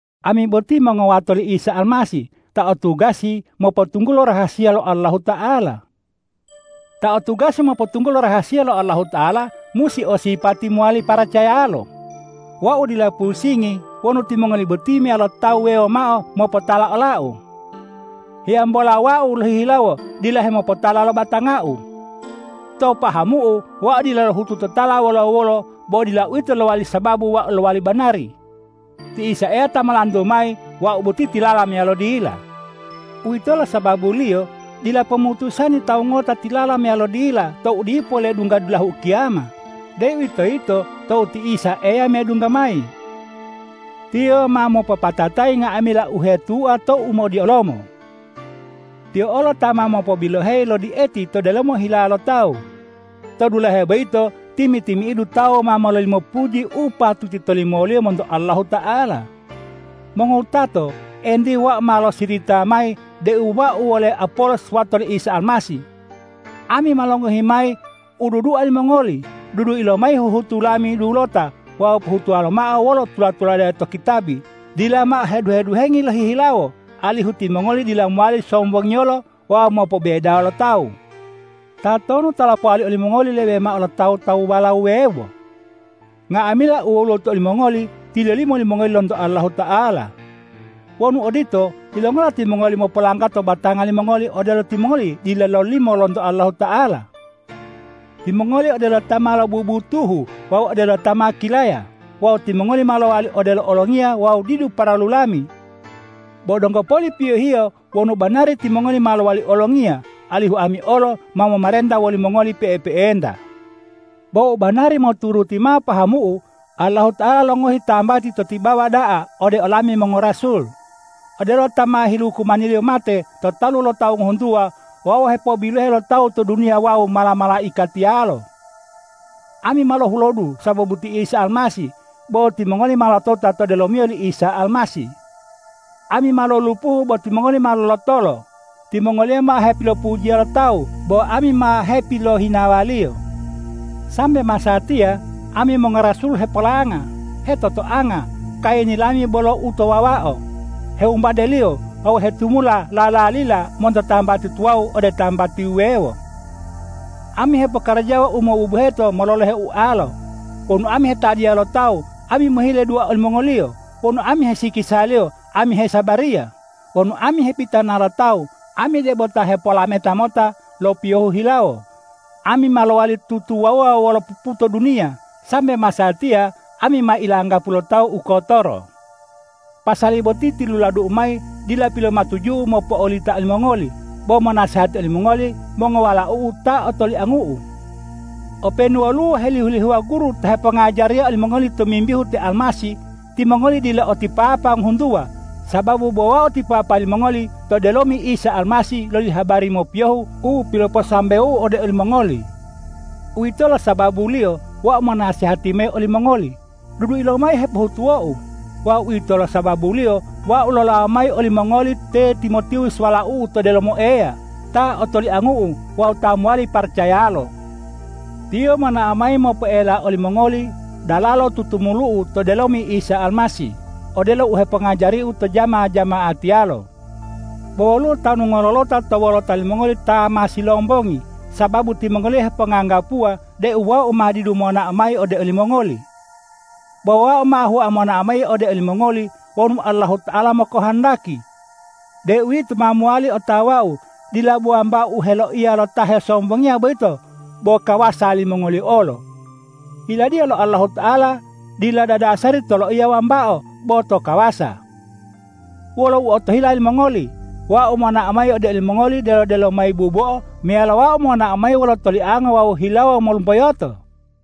Ami boti mongowato li Isa Almasih, ta o tugasi mopotunggulo rahasiya lo Allahuta'ala. Ta o tugasi mopotunggulo rahasiya lo Allahuta'ala musi o sipati mowali paracayalo. Wau dila pusingi wonu timongoli boti meyalo tawu wuwewo mao mopotala olau. Hiyambola wau lohihilawo dila hemopotala lo batangau. To pahamu'u wau dila lohutu totala wolo-wolo, bo dila uwito u lowali sababu wau lowali banari. Ti Isa Eya ta molantu mayi wau boti tilala meyalo dila. Uwitolo sababuliyo dila pomutusani tawu ngota tilala meyalo dila tou dipo ledungga dulahu ukiyama, deuwitoyito tou ti Isa Eya medungga mayi. Tiyo ma mopopatatayi nga'amila u hetua to umodiolomo. Tiyo olo ta ma mopobiloheyi lo die'eti to delomo hilawo lo tawu. To dulahe boyito timi-timi'idu tawu ma mololimo puji u patuti tolimoliyo monto Allahuta'ala. Mongowutato, entiye wau ma losirita mayi deu wau wole Apolos wato li Isa Almasih. Ami ma longohi mayi u dudua limongoli. Dudui lomayi huhutu lami dulota wawu pohutuwa lomao wolo u tula-tulade to kitabi, dila mao heduhe-duhengi lohihilawo, alihu timongoli dila mowali sombongiyolo wawu mopobebedawo lo tawu. Tatonu ta lopowali olimongoli lebe mao lo tawu-tawuwala wuwewo? Nga'amila u woluwo to olimongoli tilolimo limongoli lonto Allahuta'ala. Wonu odito, yilongola timongoli mopolanggato batanga limongoli odelo timongoli dila lololimo lonto Allahuta'ala? Timongoli odelo ta ma lobubutuhu wawu odelo ta ma kilaya; wawu timongoli ma lowali odelo olongiya wawu didu paralu lami. Bo donggo boli piyohiyo wonu banari timongoli ma lowali olongiya, alihu ami olo ma momarenta wolimongoli pe'epe'enta. Bo u banari moturuti mao pahamu'u, Allahuta'ala longohi tambati to tibawa da'a ode olami mongorasul, odelo ta ma hilukumaniliyo mate to talu lo tawu ngohuntuwa wawu hepobilohe lo tawu to duniya wawu mala-malaikatiyalo. Ami ma lohulodu sababu ti Isa Almasih, bo timongoli ma lotota to delomiyo li Isa Almasih. Ami ma lolulupuhu bo timongoli ma lolotolo; timongoli ma hepilopujiya lo tawu bo ami ma hepilohinawaliyo. Sambe masatiya ami mongorasul hepolanga, hetotoanga, kayini lami bolo u to wawao, hewumbadeliyo wawu hetumula lalalila monto tambati tuwawu ode tambati wuwewo. Ami hepokarajawa u mobubuheto mololohe ualo. Wonu ami hetadiya lo tawu, ami mohile dua olimongoliyo; wonu ami hesikisaliyo, ami hesabariya; wonu ami hepitana lo tawu, ami debo ta hepolameta mota lo piyohu hilawo; ami ma lowali tutuwawuwa wolo puputo duniya. Sambe masatiya ami ma ilanggapu lo tawu u kotoro. Pasali boti tiluladu'u mayi dila pilomatuju'u mopo'olita olimongoli, bo monasehati olimongoli mongowalau'u ta otoliangu'u. Openu woluwo helihu-lihuwa guru ta hepongajariya olimongoli tomimbihu te Almasih, timongoli dila o ti papa ngohuntuwa, sababu bo wau ti papa limongoli to delomi Isa Almasih loli habari mopiyohu u piloposambewou ode olimongoli. Uwitolo sababuliyo wau monasehati mayi olimongoli, dudui lomayi u hepohutuwou! Wawu uwitolo sababuliyo wau lolawo mayi ode olimongoli te Timotiwus walau'u to delomo Eya, ta otoliangu'u wawu ta mowali paracayalo. Tiyo monao mayi mopoela olimongoli dalalo tutumulu'u to delomi Isa Almasih, odelo u hepongajariu to jama-jama'atiyalo. Bo woluwo tanu ngololota to wolota limongoli ta ma silombongi, sababu timongoliyo heponganggapuwa deu wau ma didu monao mayi ode olimongoli. Bo wau ma hua monao mayi ode olimongoli wonu Allahuta'ala mokohondaki. Deuwito ma mowali otawau dila bo wambao u heloiya lo ta hesombongiya boyito bo kawasa limongoliyo olo. Yiladiya lo Allahuta'ala dila dadasari to loiya wambao bo to kawasa. Wolo u otohila limongoli: Wau monao mayi ode olimongoli delo-delo mayi bubo'o meyalo wau monao mayi wolo toliango wawu hilawo molumboyoto?